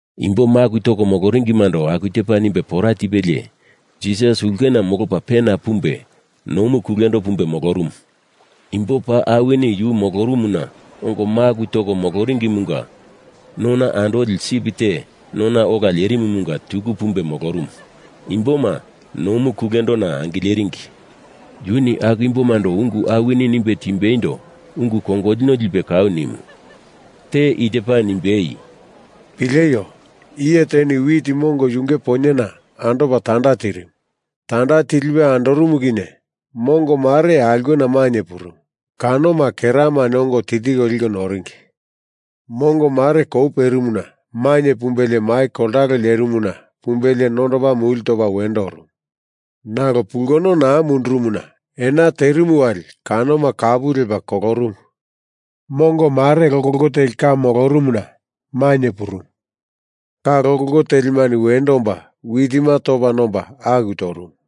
Imbo maku toko moloringimando aku tepa nimbe pora tipelie, Jisas ulkena molopa pena pumbe nomu kulendo pumbe molorumu. Imbo paa awini yu molorumuna ongo maku toko moloringimunga nona andoli sip te nona ola lerimumunga tuku pumbe molorumu, imboma nomu kulendona angileringi. Yuni aku imbomando ungu awini nimbe timbeindo ungu kongolino lipe kau nimu. Te i tepa nimbei, “Pileio! Iye teni wit mongo yunge poinyena andopa tanda tirimu. Tanda tilipe andorumu kinye mongo mare aulkena mainye purumu, kanoma keramani ongo tiltiko liko noringi. Mongo mare kou perimuna mainye pumbelie mai koltalo lerimuna pumbelie nondopa muli topa wendo orumu. Nalo pulkono naa mundurumuna ena terimu wali kanoma kapu lepa kolorumu. Mongo mare lokoloko teli ka molorumuna mainye purumu. Ka lokoloko telimani wendo omba witima topa nomba aku torumu.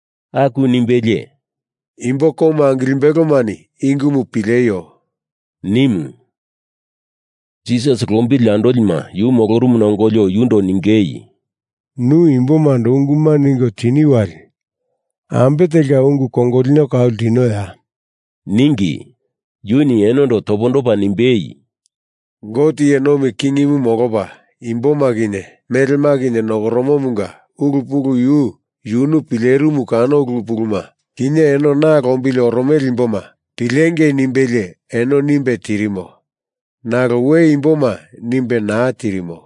Aku nimbelie, “Imbo komu angilimbelomani i ungumu pileio,” nimu. Jisas lombili andolima yu molorumuna ongolio yundo ningei, “Nu imbomando unguma ningo tini wali ambe telka ungu kongolino kau ltinoya?” ningi. Yuni enondo topondopa nimbei, “Gote iye nomi kingimu molopa imboma kinye melema kinye nokoromomunga ulu pulu yu yunu pilerimu kano ulu puluma, kinye eno na lombili oromele imboma pilengei nimbelie eno nimbe tirimo. Nalo we imboma nimbe naa tirimo.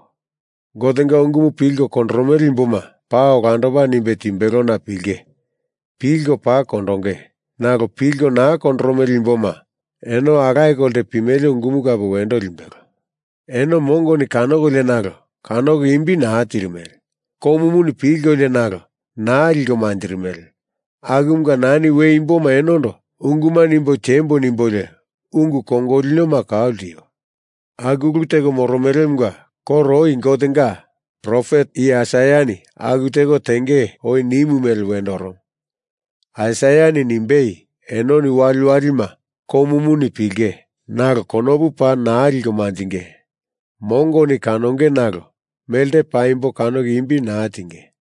Gotenga ungumu pilko kondoromele imboma paa olandopa nimbe timbelona pilinge. Pilko paa kondonge. Nalo pilko naa kondoromele imboma eno alaye kolte pimele ungumu kape wendo limbelo. Eno mongoni kanokolio nalo kanoko imbi naa tirimele. Komuni pilkolio nalo naa liko manjirimele, akumunga nani we imboma enondo unguma nimbo tiembo nimbolio ungu kongolinoma kau ltio. Aku ulu teko moromelemunga koro oi Gotenga profet iye Aisaiani aku teko tenge oi nimu mele wendo oromo. Aisaiani nimbei, Enoni waliwalima komuni pilinge nalo konopu paa naa liko manjinge; mongoni kanonge nalo melte paimbo kanoko imbi naa tienge.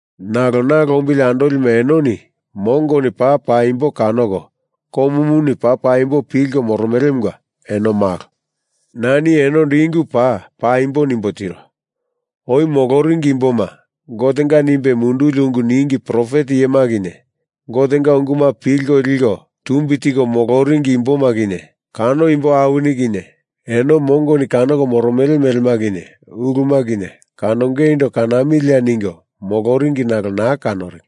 Nalo na lombili andolima enoni mongoni paa paimbo kanoko komuni paa paimbo pilko moromelemunga eno malo. Nani enondo i ungu paa paimbo nimbo tiro. Oi moloringi imboma, Gotenga nimbe munduli ungu ningi profet iyema kinye, Gotenga unguma pilko liko tumbi tiko moloringi imboma kinye, kano imbo awini kinye eno mongoni kanoko moromele melema kinye uluma kinye kanongeindo kanamilia ningo moloringi nalo naa kanoringi.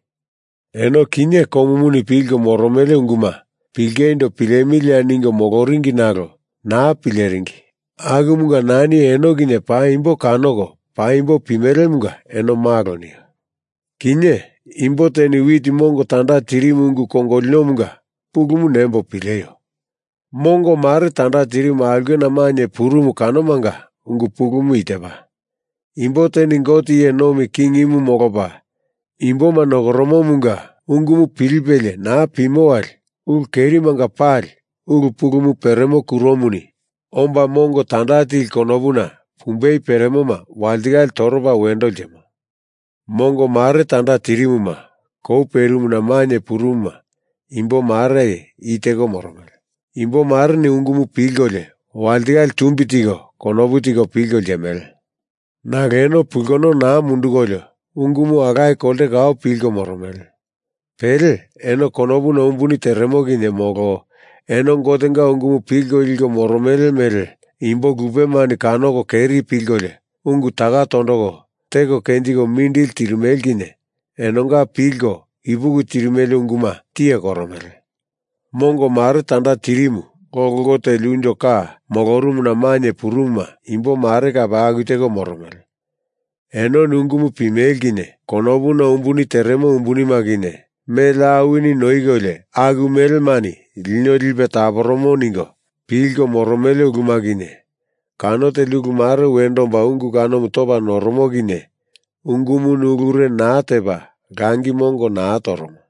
Eno kinye komuni pilko moromele unguma pilingeindo pilemilia ningo moloringi nalo naa pileringi akumunga nani eno kinye paimbo kanoko paimbo pimelemunga eno malo nio. Kinye, imbo teni wit mongo tanda tirimu ungu kongolinomunga pulumu nembo pileio. Mongo mare tanda tirimu aulkena mainye purumu kanomanga ungu pulumu i tepa: Imbo teni Gote iye nomi kingimu molopa imboma nokoromomunga ungumu pilipelie naa pimo wali ulu kerimanga pali ulu pulumu peremo kuromuni omba mongo tanda tili konopuna pumbei peremoma walitikale toropa wendo ltimo. Mongo mare tanda tirimu kou perimuna mainye purumuma imbo mare i teko moromele. Imbo mareni ungumu pilkolio walitikale tumbi tiko konopu tiko pilko ltimele. Nalo eno pulkono naa mundukolio ungumu alaye kolte kau pilko moromele. Pele eno konopuna umbuni teremo kinye molo eno Gotenga ungumu pilko liko moromele mele imbo lupemani kanoko keri pilkolio ungu taka tondoko teko kenjiko mindili tirimele kinye enonga pilko ipuki tirimele unguma tiye koromele. Mongo mare tanda tirimu lokoloko teli unjo ka molorumuna mainye purumuma imbo mare kape aku teko moromele. Enoni ungumu pimele kinye konopuna umbuni teremo umbunima kinye, mele awini noikolio aku melemani lino lipe taporomo ningo pilko moro mele uluma kinye, kano teli ulu mare wendo omba ungu kanomu topa noromo kinye ungumuni ulure naa tepa langi mongo naa toromo.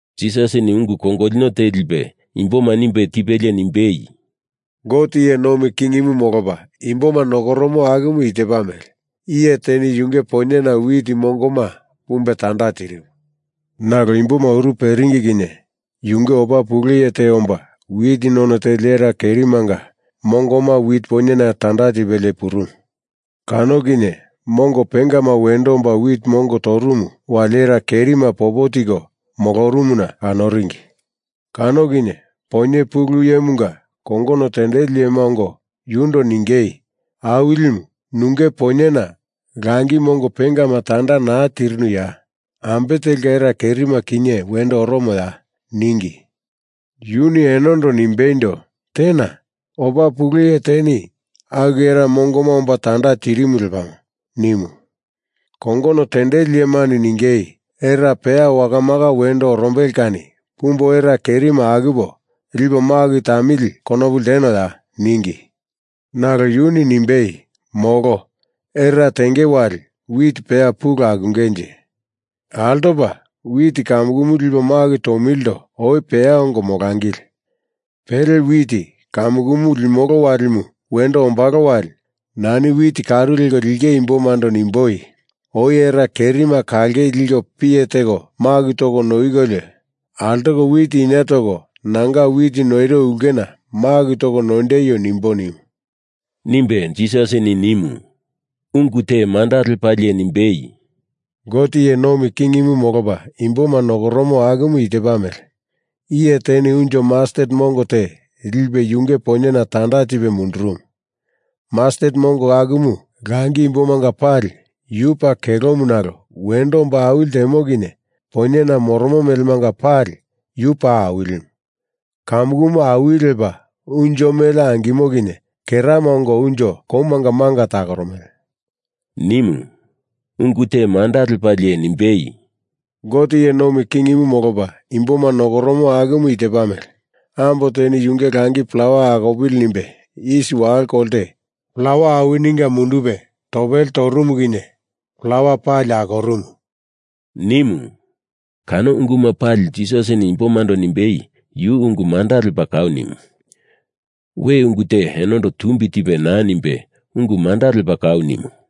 Jisasini ungu kongolino te lipe imboma nimbe tipelie nimbei, “Gote iye nomi kingimu molopa imboma nokoromo akumu i tepa mele. Iye teni yunge poinyena wit mongoma pumbe tanda tirimu. Nalo imboma uru peringi kinye yunge opa pule iye te omba wit none teli era kerimanga mongoma wit poinyena tanda tipelie purumu. Kano kinye mongo pengama wendo omba wit mongo torumu wali era kerima popo tiko molorumuna kanoringi. Kano kinye poinye pulu iyemunga kongono tendeli iyema ongo yundo ningei, ‘Awilimu, nunge poinyena langi mongo pengama tanda naa tirinuya? Ambe telka era kerima kinye wendo oromoya?’ ningi. Yuni enondo nimbeindo, ‘Tena. Opa pule iye teni aku era mongoma omba tanda tirimu lepamo,’ nimu. Kongono tendeli iyemani ningei, ‘Era peya wakamaka wendo orombele kani pumbo era kerima akupo lipo maku tamili konopu ltenoya?’ ningi. Nalo yuni nimbei, ‘Molo. Era tenge wali wit peya pulu akungenje. Altopa wit kamukumu lipo maku tomilindo oi peya ongo molangili. Pele wit kamukumu limolo walimu wendo ombalo wali nani wit karu leko lindinge imbomando nimboi, “Oi era kerima kalangei liko piye teko maku toko noikolio, altoko wit inie toko nanga wit noiro ulkena maku toko noindeio,” nimbo,’ nimu,” nimbe Jisas nimu. Ungu te manda lepalie nimbei, “Gote iye nomi kingimu molopa imboma nokoromo akumu i tepa mele. Iye teni unjo mastet mongo te lipe yunge poinyena tanda tipe mundurumu. Mastet mongo akumu langi imbomanga pali yu paa kelomu nalo wendo omba awili ltemo kinye poinyena moromo melemanga pali yu paa awilimu. Kamukumu awili lepa unjo mele angimo kinye kerama ongo unjo komanga manga takoromele,” nimu. Ungu te manda lepalie nimbei, “Gote iye nomi kingimu molopa imboma nokoromo akumu i tepa mele. Ambo teni yu langi plawa akopili nimbe isi walo kolte plawa awininga mundupe topele torumu kinye plawa pali akorumu,” nimu. Kano unguma pali Jisasini imbomando nimbe yu ungu manda lepa kau nimu. We ungu te enondo tumbi tipe naa nimbe ungu manda lepa kau nimu.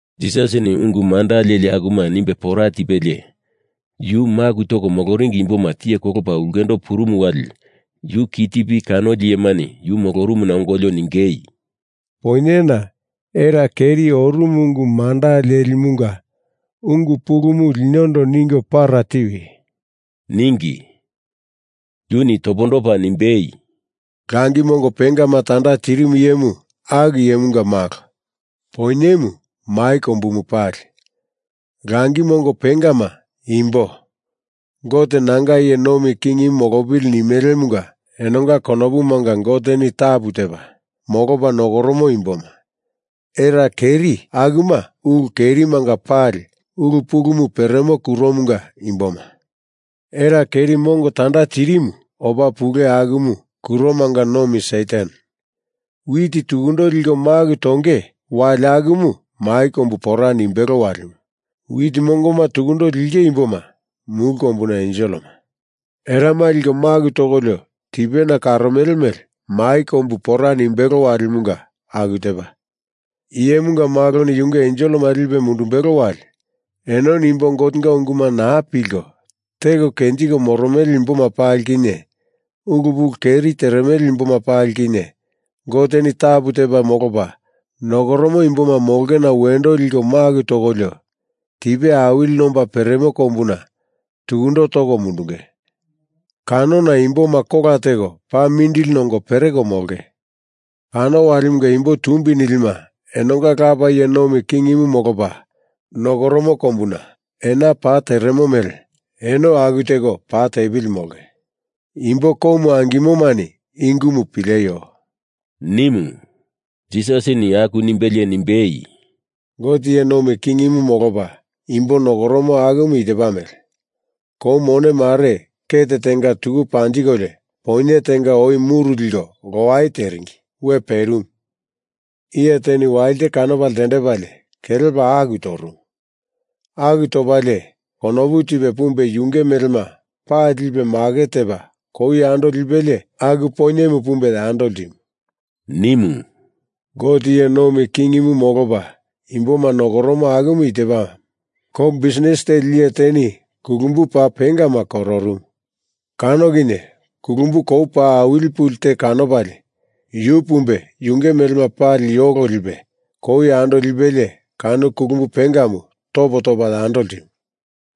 Jisasini ungu manda leli akuma nimbe pora tipelie, yu maku toko moloringi imboma tiye kolopa ulkendo purumu wali yu ki tipi kanoli iyemani yu molorumuna ongolio ningei, “Poinyena era keri orumu ungu manda lelimunga ungu pulumu linondo ningo para tiwi,” ningi. Yuni topondopa nimbei, “Langi mongo pengama tanda tirimu iyemu aku Iyemunga Malo. Poinyemu mai kombu pali. Langi mongo pengama imbo Gote nanga iye nomi kingimu molopili nimelemunga enonga konopumanga Goteni tapu tepa molopa nokoromo imboma. Era keri akuma ulu kerimanga pali ulu pulumu peremo kuromunga imboma. Era keri mongo tanda tirimu opa pule akumu kuromanga nomi Satan. Wit tukundo liko maku tonge wali akumu mai kombu pora nimbelo walimu. Wit mongoma tukundo linge imboma mulu kombuna enselema. Erama liko maku tokolio tipena karomele mele mai kombu pora nimbelo walimunga aku tepa. Iyemunga Maloni yunge enselema lipe mundumbelo wali, enoni imbo Gotenga unguma naa pilko, teko kenjiko moromele imboma pali kinye, ulu pulu keri teremele imboma pali kinye, Goteni tapu tepa molopa nokoromo imboma molongena wendo liko maku tokolio, tipe awili nomba peremo kombuna tukundo toko mundunge, kanona imboma kola teko paa mindili nongo pereko molonge. Kano walimanga imbo tumbi nilima enonga Lapa iye nomi kingimu molopa nokoromo kombuna ena pa teremo mele eno aku teko pa tepili molonge. Imbo komu angimomani i ungumu pileio,” nimu. Jisasini aku nimbelie nimbei, “Gote iye nomi kingimu molopa imboma nokoromo akumu i tepa mele: Kou mone mare ket tenga tuku panjikolio poinye tenga oi muru liko lowai teringi we perimu. Iye teni walite kanopa ltendepalie kelepa aku torumu. Aku topalie konopu tipe pumbe yunge melema pali lipe maket tepa kou yando lipelie aku poinyemu pumbe yando ltimu,” nimu. “Gote iye nomi kingimu molopa imboma nokoromo akumu i tepa: Kou bisnis teli iye teni kulumbu paa pengama kororumu. Kano kinye kulumbu kou paa awili puli te kanopalie, yu pumbe yunge melema pali yolo lipe kou yando lipelie kano kulumbu pengamu topo topa yando ltimu,”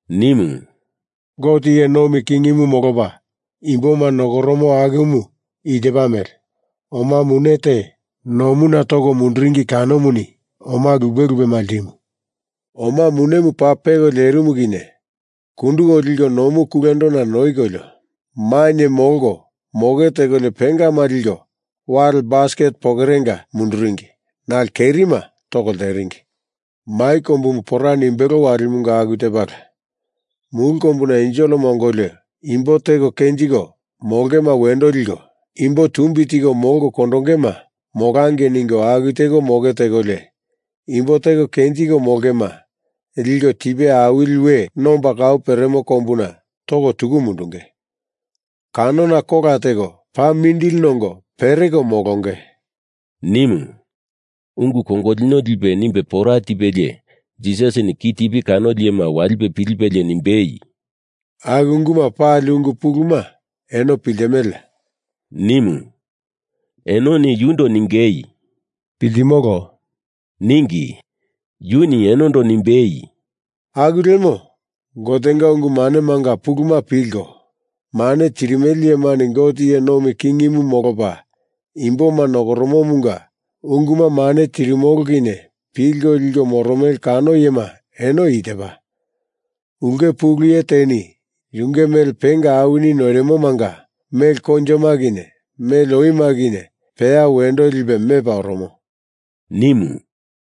nimu. “Gote iye nomi kingimu molopa imboma nokoromo akumu i tepa mele: Oma mune te nomuna toko munduringi kanomuni oma lupe lupema ltimu. Oma munemu paa peko lerimu kinye kunduko liko nomu kulendona noikolio, mainye molko moke tekolio pengama liko wali basket pokorenga munduringi nalo kerima toko lteringi. Mai kombumu pora nimbelo walimunga aku tepala. Mulu kombuna enselema ongolio, imbo teko kenjiko molongema wendo liko imbo tumbi tiko molko kondongema molangei ningo aku teko moke tekolio imbo teko kenjiko molongema liko tipe awili we nomba kau peremo kombuna toko tuku mundunge, kanona kola teko paa mindili nongo pereko molonge,” nimu. Ungu kongolino lipe nimbe pora tipelie Jisasini ki tipi kanoli iyema walipe pilipelie nimbei, “Aku unguma pali ungu puluma eno piltimeleya?” nimu. Enoni yundo ningei “Piltimolo,” ningi. Yuni enondo nimbei, “Aku lemo Gotenga ungu manemanga puluma pilko mane tirimele iyemani Gote iye nomi kingimu molopa imboma nokoromomunga unguma mane tirimolo kinye pilko liko moromele kano iyema eno i tepa: Ulke pulu iye teni yunge mele penga awini noirimomanga mele koinjoma kinye mele oima kinye peya wendo lipe mepa oromo,” nimu.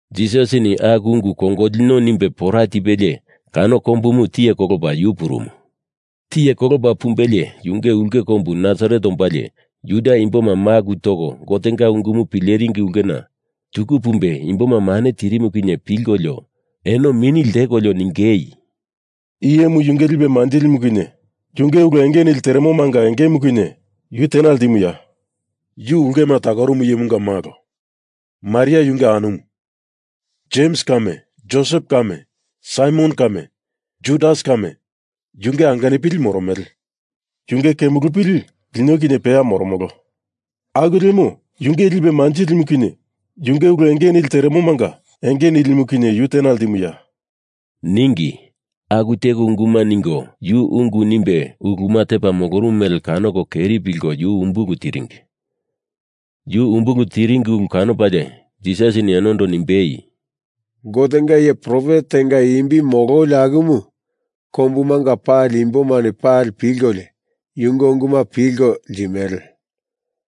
Jisasini aku ungu kongolino nimbe pora tipelie kano kombumu tiye kolopa yu purumu. Tiye kolopa pumbelie yunge ulke kombu Nasaret ombalie Juda imboma maku toko Gotenga ungumu pileringi ulkena tuku pumbe imboma mane tirimu kinye pilkolio eno mini ltekolio ningei, “I iyemu yunge lipe manjilimu kinye yunge ulu enge nili teremomanga engemu kinye yu tena ltimuya? Yu ulkema takorumu iyemunga malo, Maria yunge anumu. Jems kame, Josep kame, Saimon kame, Judas kame, yunge angenupili moromele. Yunge kemulupili lino kinye peya moromolo. Aku lemo yunge lipe manjilimu kinye yunge ulu enge nili teremomanga enge nilimu kinye yu tena ltimuya?” ningi. Aku teko unguma ningo yu ungu nimbe uluma tepa molorumu mele kanoko keri pilko yu umbulu tiringi. Yu umbulu tiringi ulu kanopalie Jisasini enondo nimbei, “Gotenga iye profet tenga imbi mololi akumu kombumanga pali imbomani pali pilkolio yunge unguma pilko ltimele.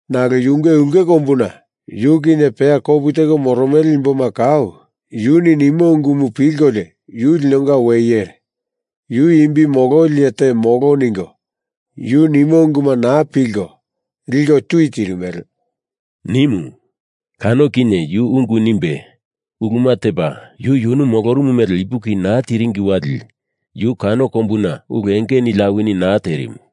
Nalo yunge ulke kombuna yu kinye peya kopu teko moromele imboma kau yuni nimo ungumu pilkolio yu linonga we iyere, yu imbi mololi iye te molo ningo yu nimo unguma naa pilko, liko tui tirimele,” nimu. Kano kinye yu ungu nimbe uluma tepa yu yunu molorumu mele ipuki naa tiringi wali yu kano kombuna ulu enge nili awini naa terimu.